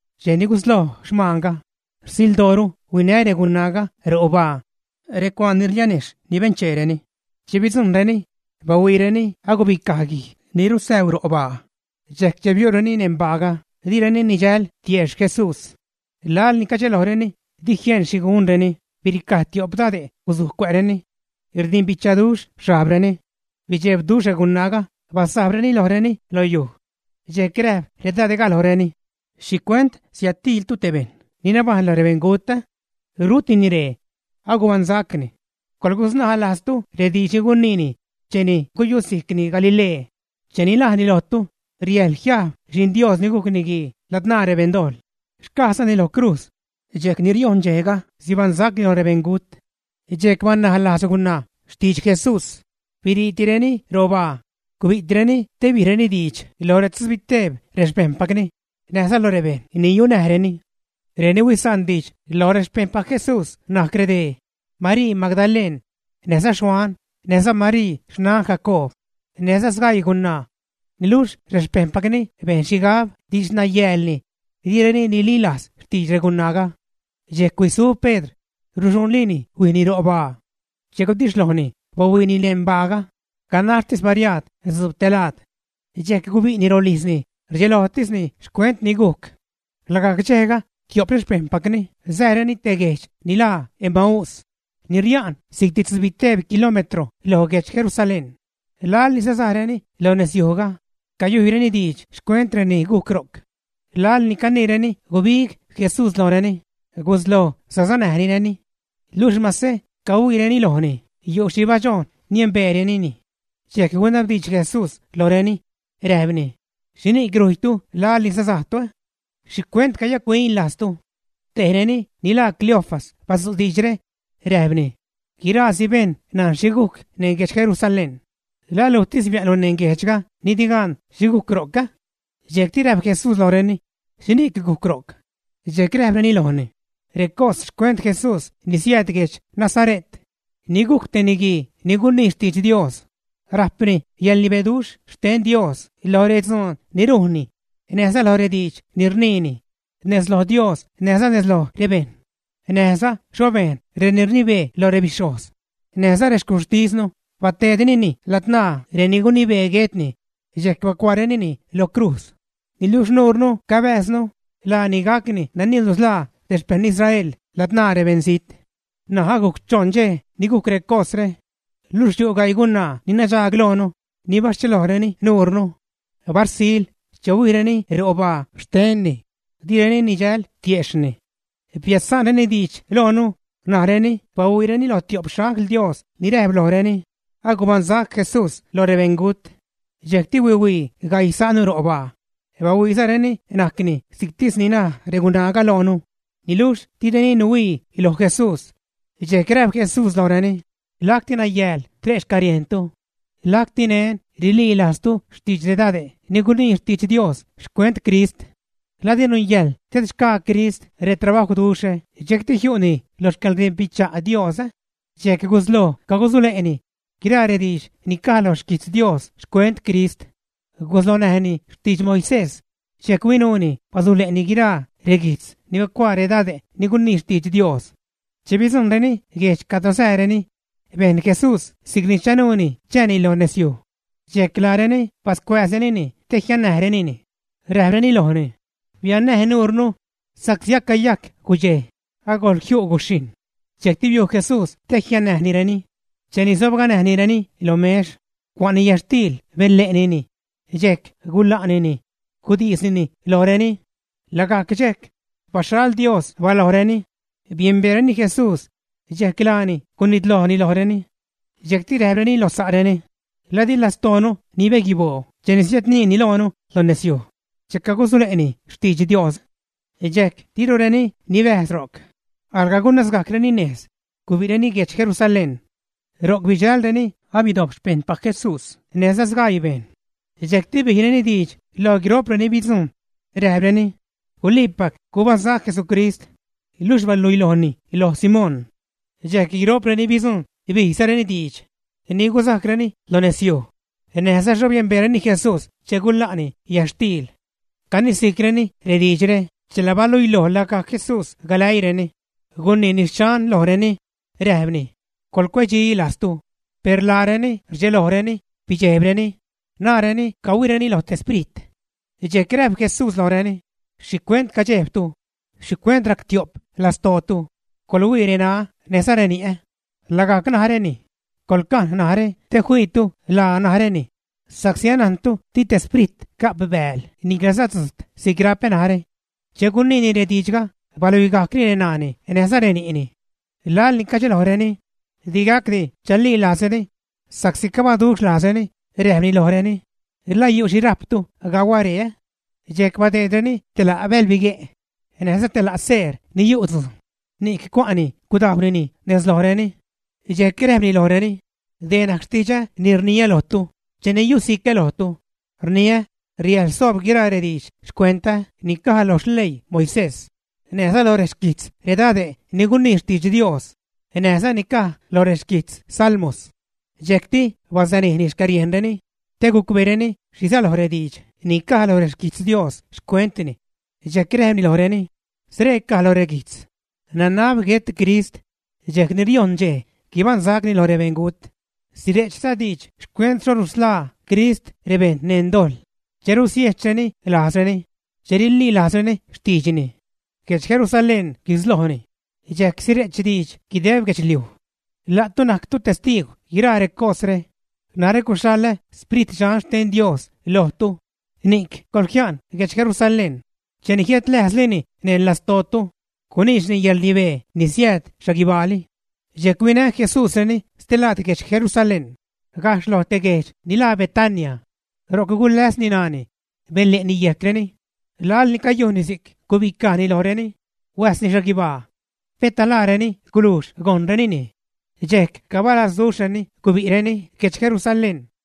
Dxej ni gusloj xmaanga, rsildooru huinä regunaaga robaa recuaan ni rlianejxh ni bencheereni. Che bidzujṉreni, bahuiireni agubicaj guij ni rusäu ro' baa. Dxejc che biu'reni neṉ baaga, direni nidxäl tiejxh Jesús. Laḻ ni cadxelojreni, di jieṉ xhi gunreni, biricaj tio'p dade' gusuj cuä'reni. Rdimbichaduxh xhajbreni. Bidxebduxh regunaaga, basajbreni lojreni lo yuj. Dxejc räjp redade'ga lojreni: ―¿Xhicuent siädtiiltu te bejṉ ni nabajṉ lo rebeṉgut, ä? Rutini ree. Agubaṉsacni. Coḻgusnaj lajztu rediidx ni guniini cheni guyusijcni Galilee, che najni lojtu: “Riäjḻ jiajb Xi'n Dios ni gujc Niguii ladzṉaa rebeṉdojḻ, xcajzani lo crujz, dxejc ni riojṉ dxejga sibaṉsacni loj rebeṉgut.” Dxejc banaj lajz regunaa xtidx Jesús, biriireni robaa, gubi'tireni te bijreni diidx lo retzubiteeb rexpejṉpacni näjza loj rebejṉ ni yunäjreni. Reni huisa'n diidx loj rexpejṉpac Jesús najc redee: Marii Magdaleṉ, näjza Xuan, näjza Marii xnan Jacoob, näjza sgaii gunaa. Niluxh rexpejṉpacni bejn xhigab didxnayäälni, direni nililajz xtidx regunaaga. Dxejc huisu Pedr, ruxuṉlini huijni ro' baa. Che gudixhlojni, bahuiini neṉ baaga, ganaxtis bariaad dzuub te laad. Dxejc gubi'ni rolijzni, rdxelojtisni xcuent ni gujc. Lagajc dxejga, tio'p rexpejṉpacni sääreni te guejdx ni laa Emaús, ni ria'n si'cti tzubiteeb kilómetro loj guedx Jerusalén. Laḻ ni sasajreni lo nezyujga, cayujyreni diidx xcuent reni gujc ro'c. Laḻ ni caniireni gubig Jesús lojreni, gusloj sasanäjnireni. Luxh mase cahuiireni lojni, yu' xhi badxojn niembeerenini. Dxejc gunabdiidx Jesús lojreni, räjpni: ―¿Xhini'c rujytu laḻ ni sasajtu, ä? ¿Xhicuent cayac-huin lajztu? Tejreni ni laa Cleofas badzu' diidxre, räjpni: ―Guiraasi bejṉ najn xhi gujc neṉ guedx Jerusalén. ¿La lujtis bia'nlu neṉ guejdxga ni di gan xhi gujc ro'c, ä? Dxejcti räjp Jesús lojreni: ―¿Xhini'c gujc ro'c? Dxejc räjpreni lojni: ―Recos xcuent Jesús ni siääd guedx Nazare't, ni gujc te niguii ni gunii xtidx Dios, rajpni yäḻrnibeduxh xten Dios loj redzuun ni rujnni näjza loj rediidx ni rniini, nez loj Dios näjza nez loj rebejṉ. Näjza xho bejn reni rnibee loj rebixhojz näjza rexcuxhtisnu, bateedrenini ladzṉaa reni gunibee guetni, dxejc bacuaarenini lo crujz. Niluxh nuurnu cabääznu laani gacni nani nusḻaa rexpejṉ Israel ladzṉaa rebeṉzijt. N̲aj agujc choṉ dxej ni gujc recosre. Luxh yu' gaii gunaa ni nadxaag loonu ni baschelojreni nuurnu. Barsil, che huijreni robaa xtenni, direni nidxäl tiejxhni. Biädsa'nreni diidx loonu najreni bahuiireni lo tio'p xangl Dios ni räjp lojreni, agubaṉsac Jesús lo rebeṉgut. Dxejcti huihuii gaii sa'nu robaa, bahuiizareni najcni si'ctis ni naj regunaaga loonu, niluxh direni nuhuii loj Jesús. Dxejc räjp Jesús lojreni: ―¡Lacti nayääl tre' xcäriejntu! Lacti neṉ rililajztu xtidx redade' ni gunii xtidx Dios xcuent Crist. ¿La di nungäjḻ tedxgaa Crist retrabajwduxhre dxejcti jiu'ni lo xcäḻrdimbicha' Dios, ä? Dxejc gusloj cagusule'ni guiraa rediidx ni caj lo xquijtz Dios xcuent Crist. Guslonäjni xtidx Moisés, dxejc huinuuni basule'ni guiraa reguijtz ni bacuaa redade' ni gunii xtidx Dios. Che bidzujṉreni guejdx cadro sääreni, bejn Jesús si'cni chanuuni chääni lo nezyuj. Dxejc laareni bascuääzrenini te jiannäjnireni, räjpreni lojni: ―Biannäj nuurnu, sa'csi acayajc gudxej, agojl jiu' guxhijṉ. Dxejcti biu' Jesús te jiannäjnireni. Cheni sobganäjnireni lo mex, cua'ni yätxtiil, benle'nini, dxejc gula'nini, gudisnini lojreni. Lagajc dxejc, baxhal Dios balojreni, biembeereni Jesús, dxejc laani gunitlojni lojreni. Dxejcti räjpreni lo sa'reni: ―¿La di lastoonu nibeguiboo cheni siädniini loonu lo nezyuj, che cagusule'ni xtidx Dios? Dxejc dirureni nibäjz ro'c, alga gunasgajcreni nez, gubi'reni guedx Jerusalén. Ro'c bidxälreni abidojp xpejṉpac Jesús näjza sgaii bejṉ. Dxejcti bijreni diidx loj guiro'preni bidzujṉ, räjpreni: ―Guliipac gubaṉsac Jesucrist, luxh baluilojni loj Simón. Dxejc guiṟo'p reni bidzujṉ bijzareni diidx ni gusajcreni lo nezyuj, näj xho biembeezareni Jesús che gula'ni yätxtiil. Canisi'creni rediidxre chela baluiloj lagajc Jesús galäiireni, guniini xchan lojreni, räjpni: ―¡Coḻcuecdxi lajztu! Per laareni rdxelojreni bidxejbreni, naareni cahuiireni lo te sprit. Dxejc räjp Jesús lojreni: ―¿Xhicuent cadxejbtu? ¿Xhicuent rac tio'p lastootu? ¡Coḻhuii reṉaä, näjza reni'ä! Lagajc naräni. Coḻcajn narä te fiipactu laa naräni, sa'csi anajntu di te sprit ga'p bääl niclaza tzujt si'c rapä narä. Che guniini rediidxga, baluigajcni reṉaani näjza reni'ni. Laḻ ni cadxelojreni, di gacdi chalilajzreni, sa'csi cabaduxh lajzreni, räjpni lojreni: ―¿La yu' xhi rajptu gauä ree, ä? Dxejc badeedreni te la' bälbigue', näjza te la' seer ni yu' tzujn. Ni'c cua'ni gudajwnini nez lojreni. Dxejc räjpni lojreni: ―Dee najc xtidxä ni rniä lojtu cheni yusicä lojtu, rniä riäjḻ soob guiraa rediidx xcuentä ni caj lo xleii Moisés, näjza lo rexquijtz redade' ni gunii xtidx Dios näjza ni caj lo rexquitz Salmos. Dxejcti basanijni xcäriejnreni te gucbeereni xhi säloj rediidx ni caj lo rexquijtz Dios xcuentni. Dxejc räjpni lojreni: ―Scree caj lo reguijtz: Nanab guet Crist, dxejc ni riojṉ dxej, guibaṉsacni loj rebeṉgut. Sire'chza diidx xcuent xho rusḻaa Crist rebejṉ neṉ dojḻ che rusiejchreni lajzreni, che rililajzreni xtiidxni. Guedx Jerusalén guislojni, dxejc sire'ch diidx guideb guedxliuj. La'tu najctu testiigw guiraa recosre. Narä suxhaḻä Sprit Dxan xten Dios lojtu, ni'c coḻjia'n guedx Jerusalén cheni jiädläjzlini neṉ lastootu, guniidxni yäḻrnibee ni siääd xhaguibaali. Dxejc huinä Jesúsreni stelaad guedx Jerusalén gajxh lo te guejdx ni laa Betania. Ro'c guläsni ṉaani, benle'ni yejcreni. Laḻ ni cayujnni si'c, gubicajni lojreni, huäjsni xhaguibaa. Peta laareni gulujx gojnrenini, dxejc cabalazduxhreni gubi'reni guedx Jerusalén.